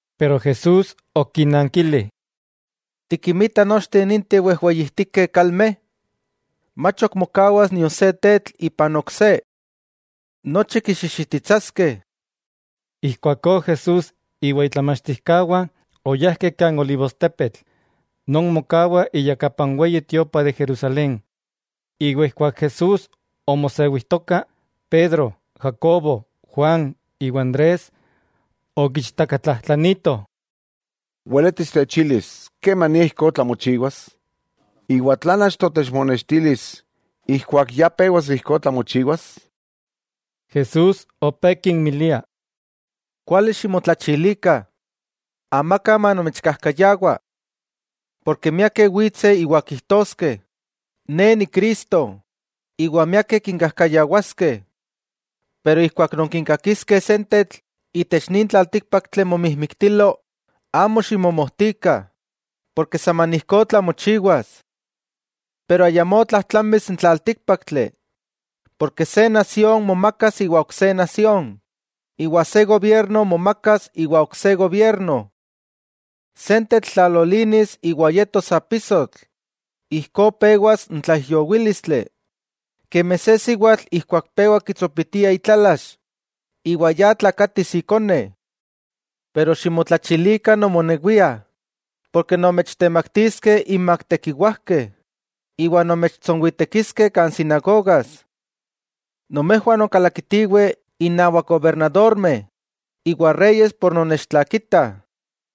Jesús okinankili: —¿Tikinmita nochteh ninteh wejweyijtikeh kalmeh? Mach ok mokawas nion se tetl ipan ok se. Nochi kixixititsaskeh. Ijkuakó Jesús iwa itlamachtijkawah oyajkeh kan olivostepetl, non mokawa iyakapa n Weyi Tiopa de Jerusalén. Iwa ijkuak Jesús omosewijtoka, Pedro, Jacobo, Juan iwa Andrés okiichtakatlajtlanitoh: —Weletis techilis, ¿kemania ijkó tlamochiwas? ¿Iwa tlan achto techmonextilis ijkuak ya pewas ijkó tlamochiwas? Jesús opé kinmilia: —Kuali ximotlachilikah, amaka manomechkajkayawa. Porke miakeh witseh iwa kijtoskeh: “Ne Ni Cristo”, iwa miakeh kinkajkayawaskeh. 'Ijkuak nonkikakiskeh sentetl itech nin tlaltíkpaktli momijmiktilo, amo ximomojtikah saman ijkó tlamochiwas. Pero ayamó tlajtlamis n tlaltíkpaktli. Porke se nasión momakas iwa ok se nasión, iwa se gobierno momakas iwa ok se gobierno. Sentetl tlalolinis iwa yetos apisotl, ijkó pewas n tlaijyowílistli, kemi se siwatl ijkuak pewa kitsopitia itlalax iwa ya tlakatis ikone. 'Ximotlachilikah nomonewiah, porke nomechtemaktiskeh inmak tekiwajkeh, iwa nomechtsonwitekiskeh kan sinagogas. Nomejwah nonkalakitiweh innawak gobernadormeh iwa reyes por nonnechtlakitah,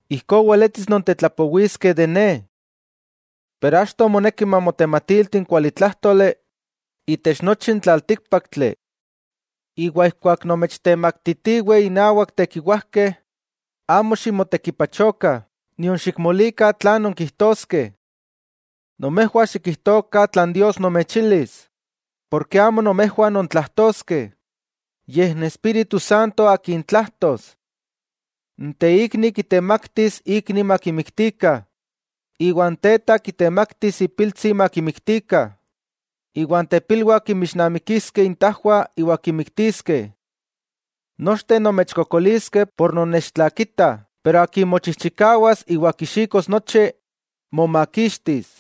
ijkó weletis nontetlapowiskeh de Ne. Pero achto moneki mamotematilti n kualitlájtoli itech nochi n tlaltíkpaktli. Iwa ijkuak nomechtemaktitiweh inawak tekiwajkeh, amo ximotekipachokah nion xikmolikah tlan nonkijtoskeh. Nomejwah xikijtokah tlan Dios nomechilis, amo nomejwah nontlajtoskeh, yej n Espíritu Santo Akin tlajtos. N teikni kitemaktis ikni makimiktikah, iwa n teta kitemaktis ipiltsi makimiktikah, iwa n tepilwah kinmixnamikiskeh intajwah iwa kinmiktiskeh. Nochteh nomechkokoliskeh ken nonnechtlakitah, pero akin mochijchikawas iwa kixikos nochi, momakixtis.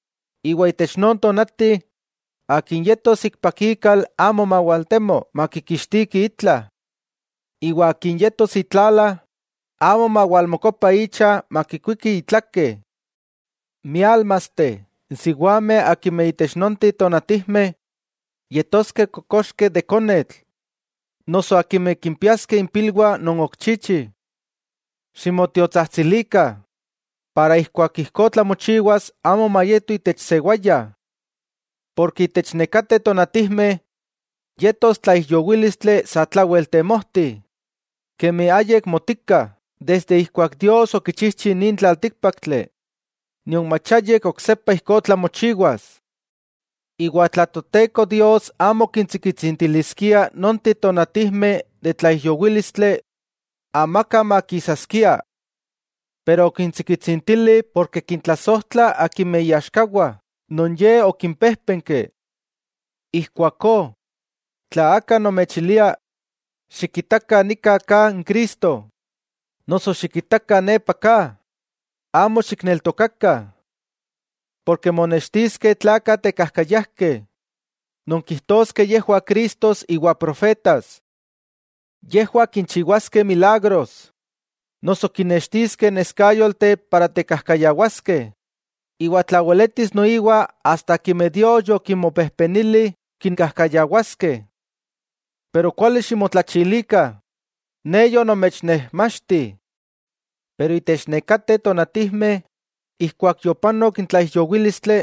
iwa itech non tonati, akin yetos ikpak ikal amo mawaltemo makikixtiki itla; iwa akin yetos itlala amo mawalmokopa icha makikuiki itlake. ¡Miálmasteh, n siwameh akimeh itech nonteh tonatijmeh yetoskeh kokoxkeh de konetl noso akimeh kimpiaskeh impilwah non ok chichih! Ximotiotsajtsilikah, para ijkuak ijkó tlamochiwas amo mayeto itech sewaya. Porke itech nekateh tonatijmeh yetos tlaijyowílistli satlawel temojti, kemi ayik motika desde ijkuak Dios okichijchi nin tlaltíkpaktli, nion mach ayik oksepa ijkó tlamochiwas. Iwa tla Toteko Dios amo kintsikitsintiliskia nonteh tonatijmeh de tlaijyowílistli, amaka makisaskia. Pero okintsikitsintili porke kintlasojtla iaxkawah, non Ye okimpéjpenki. 'Ijkuakó, tla aka nomechilia: “Xikitakah nika ka n Cristo”, noso “Xikitakah, nepa ka”, amo xikneltokakah. Porke monextiskeh tlakah tekajkayajkeh non kijtoskeh yejwah cristos iwa profetas. Yejwah kinchiwaskeh milagros noso kinnextiskeh neskáyolteh para tekajkayawaskeh, iwa tla weletis noiwa asta akimeh Dios yokinmopejpenili kinkajkayawaskeh. Pero ¡kuali ximotlachilikah! Ne yonomechnejmachti. 'Itech nekateh tonatijmeh, ijkuak yopanok n tlaijyowílistli,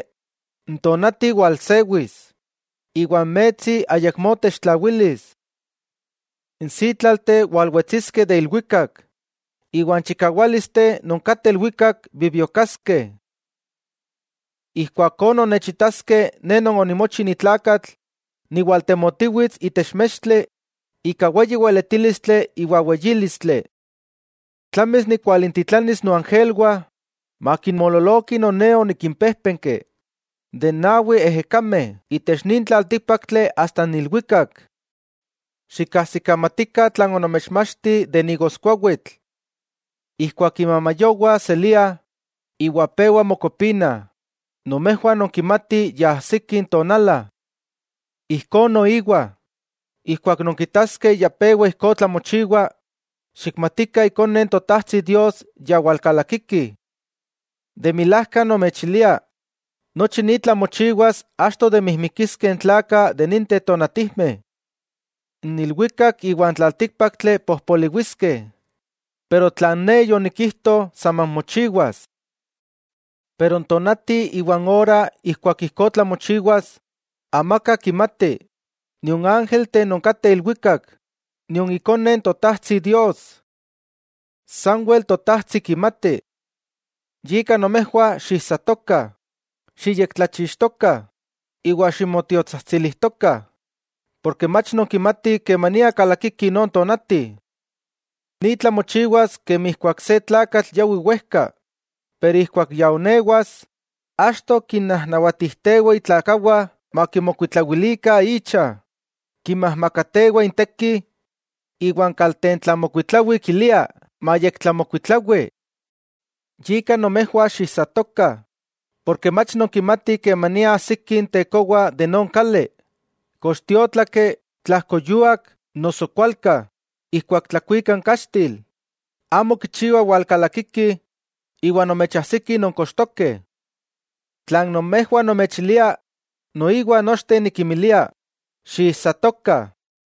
n tonati walsewis iwa n metsi ayakmó techtlawilis. N sítlalteh walwetsiskeh de ilwikak, iwa n chikawálisteh non kateh ilwikak bibiokaskeh. Ijkuakó nonnechitaskeh Ne Non onimochi ni tlakatl niwaltemotiwits itech mextli ika weyi weletílistli iwa weyílistli. Tlamis nikwalintitlanis noangelwah makinmoololokih non Ne onikinpéjpenki de n nawi ejekameh itech nin tlaltíkpaktli asta n ilwikak. 'Xikajsikamatikah tlan onomechmachti de n igoskuawitl: ijkuak imamayowah seliah, iwa pewa mokopinah, nomejwah nonkimatih ya ajsiki n tonala. Ijkó noiwa, ijkuak nonkitaskeh ya pewa ijkó tlamochiwa, xikmatikah Ikone n Totajtsi Dios ya walkalakiki. De milajka nomechilia nochi ni tlamochiwas achto de mijmikiskeh n tlakah de ninteh tonatijmeh. N ilwikak iwa n tlaltíkpaktli pojpoliwiskeh pero tlan Ne yonikijto saman mochiwas. 'N tonati iwa n ora ijkuak ijkó tlamochiwas, amaka kimati, nion ángelteh non kateh ilwikak, nion Ikone n Totajtsi Dios. Sanwel Totajtsi kimati. 'Yika nomejwah xiijsatokah, xiyektlachixtokah iwa ximotiotsajtsilijtokah, porke mach nonkimatih kemania kalakiki non tonati. Ni tlamochiwas kemi ijkuak se tlakatl yawi wejka, pero ijkuak ya oonewas, achto kinnajnawatijtewah itlakawah makimokuitlawilikah icha, kinmajmakatewa inteki iwa n kaltentlamokuitlawi kilia mayektlamokuitlawi. Yika nomejwah xiijsatokah, porke mach nonkimatih kemania ajsiki n tekowa de non kali, kox tiótlaki, tlajkoyuak noso kualka ijkuak tlakuika n kaxtil, amo kichiwa walkalakiki iwa nomechajsiki nonkochtokeh. Tlan nomejwah nomechilia, noiwa nochteh nikinmilia: Xiijsatokah.